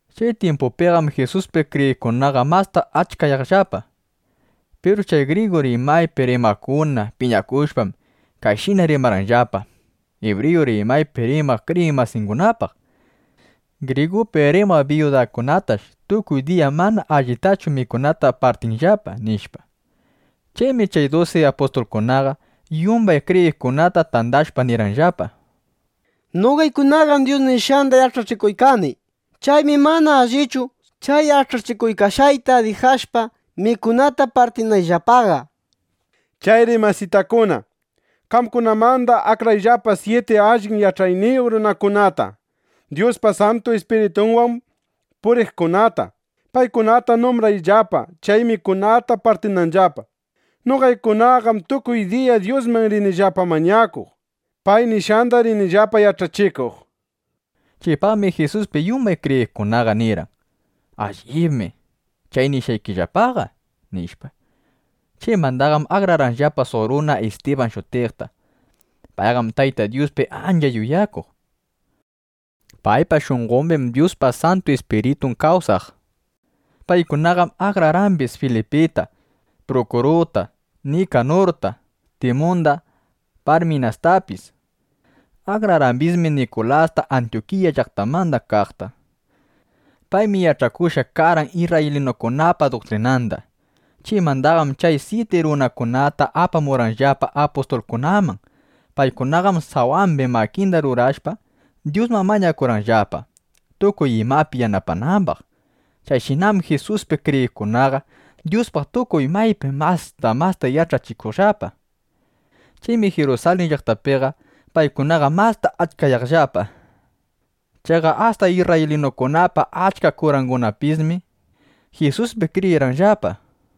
Chay tyimpuqam Jisuspi kriyiqkunaqa masta achkayaqllapa. Piru chay grigu rimaypi rimaqkuna piñakushpam, kayshina rimarqanllapa ibriyu rimaypi rimaq kriyiq masingunapaq: —Grigupi rimaq biyudakunatash tukuy diya mana allitachu mikunata partinllapa, nishpa. Chaymi chay dusi apustulkunaqa yumbay kriyiqkunata tandashpa nirqanllapa: —Noqaykunaqam Dyus nishqanda yach'achikuykani. Chaymi mana allichu, chay yach'achikuykashqayta dijashpa, mikunata partinayllapaqa. Chayri masitakuna, qamkunamanda akrayllapa syiti allin yach'ayniyuq runakunata, Dyuspa Santu Ispiritunwan puriqkunata. Paykunata numbrayllapa, chay mikunata partinanllapa. Noqaykunaqam tukuy diya Dyusman rinillapa mañakuq. Pay nishqanda rinillapa yach'achikuq, nishpa. Chaypaqmi Jisuspi yumban kriyiqkunaqa nirqan: —Allibmi chay nishqaykillapaqa, nishpa. Chaymandaqam akrarqanllapa suq runa Istiban shutiqta. Payqam Tayta Dyuspi ancha yuyakuq. Paypa shunqombim Dyuspa Santu Ispiritun kawsaq. Paykunaqam akrarqambis Filipita, Prukuruta, Nikanurta, Timunda, Parminastapis. Akrarqambismi Nikulasta Antyukiya llaqtamanda kaqta. Paymi yach'akushqa karqan isrraylinukunapa duktrinanda. Chaymandaqam chay syiti runakunata apamurqanllapa apustulkunaman. Paykunaqam sawambi makinda rurashpa, Dyusman mañakurqanllapa, tukuy imapi yanapanambaq. Chayshinam Jisuspi kriyiqkunaqa Dyuspaq tukuy maypi masta masta yach'achikuqllapa. Chaymi Jirusalin llaqtapiqa paykunaqa masta achkayaqllapa. Chaqa asta isrraylinukunapa achka kurangunapismi Jisuspi kriyirqanllapa.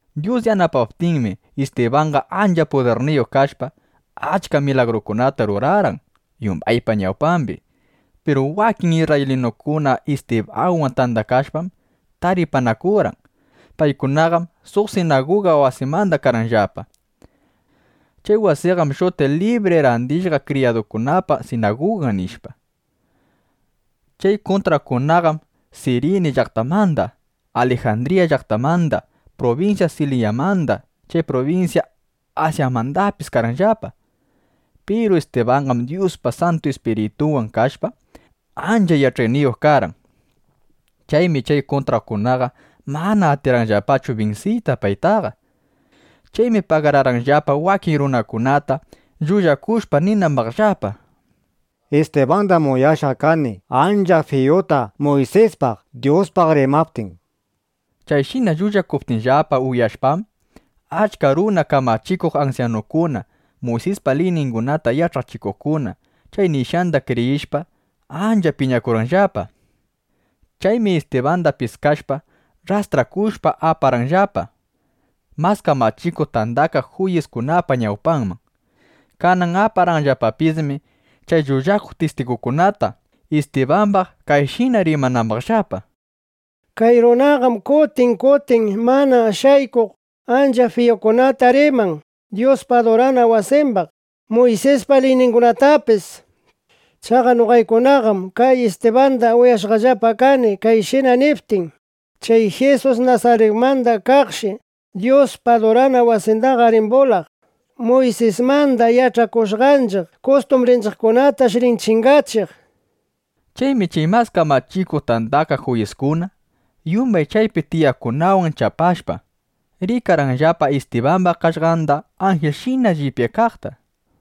Dyus yanapaptinmi, Istibanqa ancha pudirniyuq kashpa, achka milagrukunata rurarqan yumbaypa ñawpambi. Piru wakin isrraylinukuna Istibanwan tandakashpam, taripanakurqan. Paykunaqam suq sinaguga wasimanda karqanllapa. Chay wasiqam shutiq Libri Randishqa Kriyadukunapa sinagugan, nishpa. Chay kuntraqkunaqam Sirini llaqtamanda, Alijandriya llaqtamanda, prubinsya Silisyamanda, chay prubinsya Asyamandapis karqanllapa. Piru Istibanqam Dyuspa Santu Ispiritunwan kashpa, ancha yach'ayniyuq karqan. Chaymi chay kuntraqkunaqa mana atirqanllapachu binsiyta paytaqa. Chaymi pagararqanllapa wakin runakunata, llullakushpa ninambaqllapa: “Istibandam uyashqa kani, ancha fiyuta Muysispaq, Dyuspaq rimaptin”, nishpa. Chayshina llullakuptinllapa uyashpam, achka runa, kamachikuq ansyanukuna, Muysispa liyningunata yach'achikuqkuna chay nishqanda kriyishpa, ancha piñakurqanllapa. Chaymi Istibanda piskashpa, rrastrakushpa, aparqanllapa Mas Kamachikuq Tandakaq Juyiskunapa ñawpanman. Kanan aparqanllapapismi chay llullakuq tistigukunata, Istibambaq kayshina rimanambaqllapa: —Kay runaqam kutin kutin mana shaykuq ancha fiyukunata riman Dyuspa adurana wasimbaq, Muysispa liyningunapaqpis. Chaqa noqaykunaqam kay Istibanda uyashqallapa kani kayshina niptin: Chay Jisus Nasaritmanda kaqshi Dyuspa adurana wasindaqa rin bulaq. Muysismanda yach'akushqanchiq kustumbrinchiqkunatash rin chingachiq, nishpa. Chaymi chay Mas Kamachikuq Tandakaq Juyiskuna, yumbay chaypi tiyaqkunawan chapashpa, rikarqanllapa Istibamba qaqllanda anjilshina llipyaykaqta.